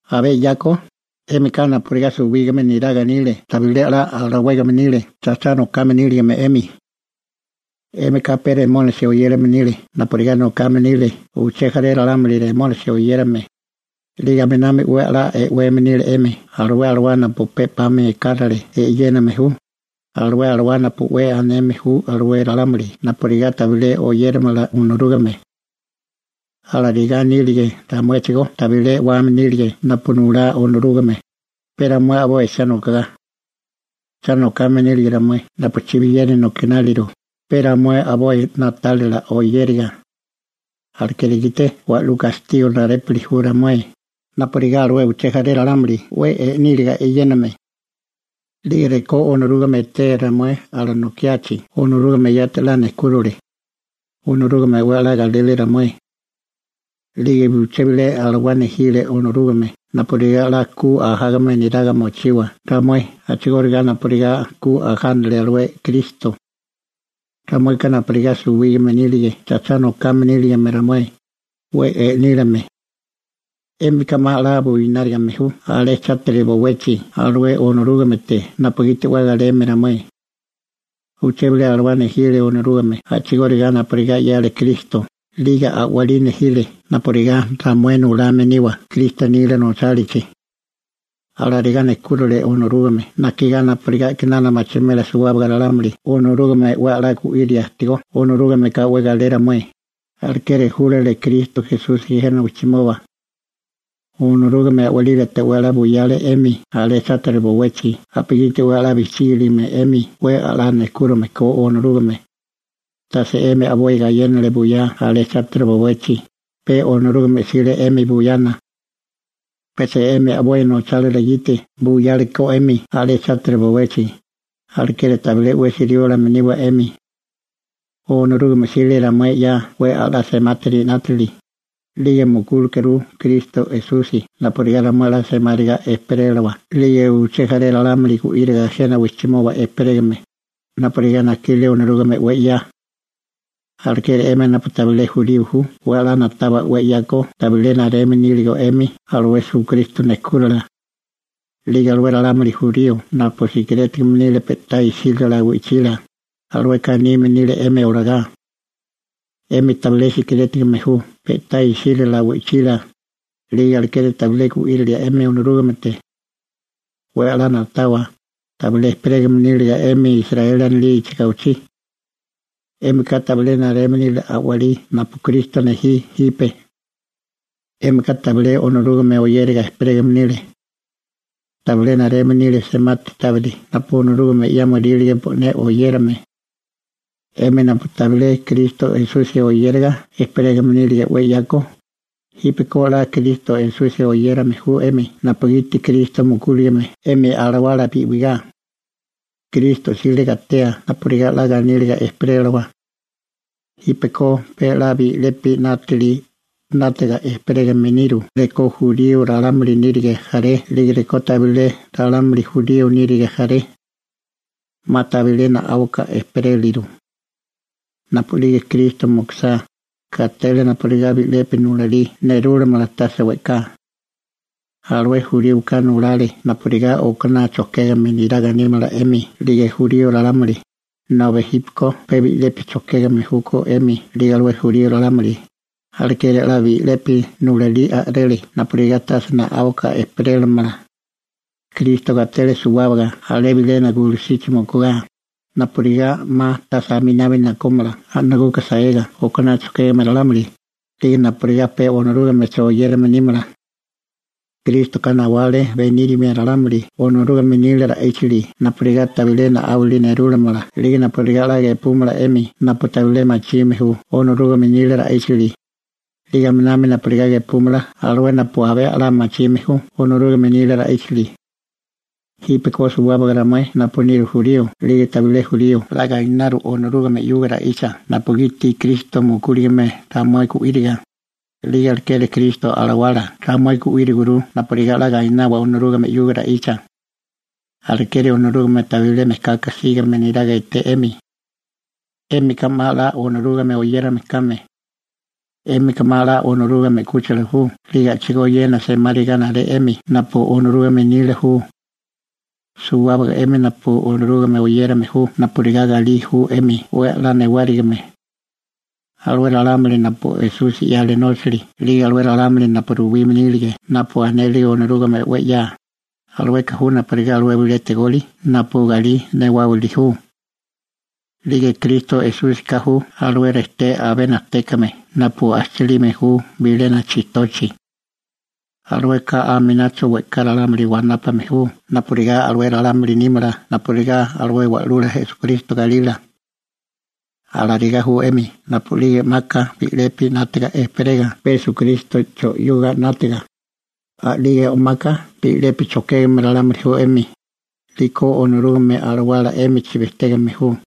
Abé 'yako, 'émika napurigá suwígame neraga nile tabilé a'lá alawégame nile cha cha nokame níligame 'emi. 'Émika pe Remónisi (Riablo) oyérame nile napurigá nokame nile uché jaré ralámuli Remónisi oyérame, 'lige aminami 'we 'la e'weme nile 'emi alué alawá napu pe 'pami ekárale e'yéname ju, alué alawá napu 'we aneme ju alué ralámuli napurigá tabilé oyéramala Onorúgame. Alarigá nírige ramuéchigó tabilé e'wame nírige napu nulá Onorúgame, pe ramué a'boi cha nokagá. Cha nokame nírige ramué napu chibiyeri nokináliru, pe ramué a'boi na'tálila oyériga. Alekeri gite wa'lú gastigo narépuli ju ramué, napurigá alué uché jaré ralámuli 'we e'níliga e'yéname. 'Lige rekó Onorúgame etee ramué alanokiachi Onorúgame yati 'la nejkúrile. Onorúgame 'we 'la galele ramué. 'Lige uché bilé alawá nejile Onorúgame napurigá ku 'la ajágame neraga mochiwa ramué a'chigóriga napurigá ku ajánale alué Kristo. Ramueka napurigá suwígame nírige cha cha nokame níligame ramué, 'we e'nílime. 'Émika 'ma 'la buinárigame ju alé chátiri bowechi alué Onorúgamete napugiti 'we galeme ramué. Uché bilé alawá nejile Onorúgame a'chigóriga napurigá 'yale Kristo 'lige a'walí nejile napurigá ramué nulame niwa Kristo nila nochálichi. Alarigá nejkúrile Onorúgame najkigá napurigá a'kinana machimela suwábaga ralámuli Onorúgame 'we 'la gu'íria ajtigó Onorúgameka 'we galé ramué, alekeri júlale Kristo Esusi jena wijchimoba. Onorúgame a'walílate 'we 'la buyale 'emi alé chátiri bowechi napugiti 'we 'la bijchígiligame 'emi 'we 'la nejkúrime ko Onorúgame. Tase 'emi a'boi gayénale buyá alé chátiri bowechi, pe Onorúgame 'sile 'emi buyana. Pecha 'emi a'boi nochálila gite buyale ko 'emi alé chátiri bowechi, alekeri tabilé 'wesi riólame niwa 'emi. Onorúgame 'sile ramué 'ya 'we a'lá semátiri 'nátili, 'lige mukúlekuru Kristo Esusi napurigá ramué 'la semáriga ejperélawa 'lige uché jaré ralámuli gu'íriga jena wijchimoba ejperégame, napurigá najkile Onorúgame 'we 'ya. Alekeri 'emi napu tabilé jurío ju 'we 'la na'tawa 'we 'yako tabilé nareme níligo 'emi alué Esukristo nejkúrala. 'Lige alué ralámuli jurío napu sikirétigame nile pe'tá isílala wi'chila, alueka anime nile 'emi olagá: «'Émika tabilé sikirétigame ju pe'tá isílala wi'chila, 'lige alekeri tabilé gu'írilia 'emi Onorúgamete.» 'We 'la na'tawa, tabilé ejperégame níligo 'emi alé Israeli anilichi gawichí. 'Émika tabilé nareme nile a'walí napu Kristo nejí jipe. 'Émika tabilé Onorúgame oyéraga ejperégame nile. Tabilé nareme nile semati tábiri napu Onorúgame 'yámorílige bo'né oyérame. 'Emi napu tabilé Kristo Esusi oyéraga ejperégame nílige 'we 'yako, jípeko 'la Kristo Esusi oyérame ju 'emi napugiti Kristo mukúligame 'emi alawala bi'wigá. Kristo 'sile gatea napurigá 'la ganíliga ejperélawa. Jípeko pe bi'lepi 'nátili 'nátaga ejperégame niru rekó jurío ralámuli nírige jaré 'lige rekó tabilé ralámuli jurío nírige jaré. 'Ma tabilé na'áuka ejperéliru. Napu'lige Kristo mukusá, gatele napurigá bi'lepi nulalí nerúlamala tase we'ká. Alué juríoka nulale napurigá okaná chojkégame neraga nímala 'emi 'lige jurío ralámuli, nobi jípeko pe bi'lepi chojkégame júkó 'emi 'lige alué jurío ralámuli. Alekeri 'la bi'lepi nulalí a'rele napurigá tase na'áuka ejperélamala. Kristo gatele suwábaga alé bilena gulusichi mukugá, napurigá 'ma tase aminabi nakómala a'naguka saega okaná chojkégame ralámuli, 'lige napurigá pe Onorúgamecho oyérame nímala. Krístoka nawale benírimia ralámuli Onorúgame nila ra'íchali napurigá tabilé na'áwali nerúlamala 'lige napurigá 'la gepúmala 'emi napu tabilé machime ju Onorúgame nila ra'íchali, 'lige aminami napurigá gepúmala alué napu abé 'la machime ju Onorúgame nila ra'íchali. Jípeko suwábaga ramué napu niru jurío 'lige tabilé jurío 'la gainaru Onorúgame 'yuga ra'icha napugiti Kristo mukúligame ramué gu'íriga, 'lige alekeri Kristo Alawala ramué gu'íriguru napurigá 'la gainawa Onorúgame 'yuga ra'icha. Alekeri, Onorúgame tabilé mejkaka sígame neraga eté 'emi. 'Émika 'ma 'la Onorúgame oyérame kame. 'Émika 'ma 'la Onorúgame 'kúchila ju 'lige a'chigóyéna semáriga naré 'emi napu Onorúgame nila ju. Suwábaga 'emi napu Onorúgame oyérame ju napurigá galí ju 'emi 'we 'la newárigime. Alué ralámuli napu Esusi 'yale nóchali 'lige alué ralámuli napu ruwime nílige napu anele Onorúgame 'we 'ya, alueka ju napurigá alué bilé tegoli napu galí newáwili ju. 'Lige Kristo Esúsika ju alué rejté abé najtékame napu ajchilime ju bilena chijtochi. Alueka aminacho we'ká ralámuli wanápame ju napurigá alué ralámuli nímala napurigá Wa'lula Esukristo galila. Alarigá ju 'emi napu'lige o'maka bi'lepi 'nátaga ejperega pe Esukrístocho 'yuga 'nátaga, a'lige o'maka bi'lepi chojkégame ralámuli ju 'emi, 'liko Onorúgame Alawala 'émichi bejtégame ju.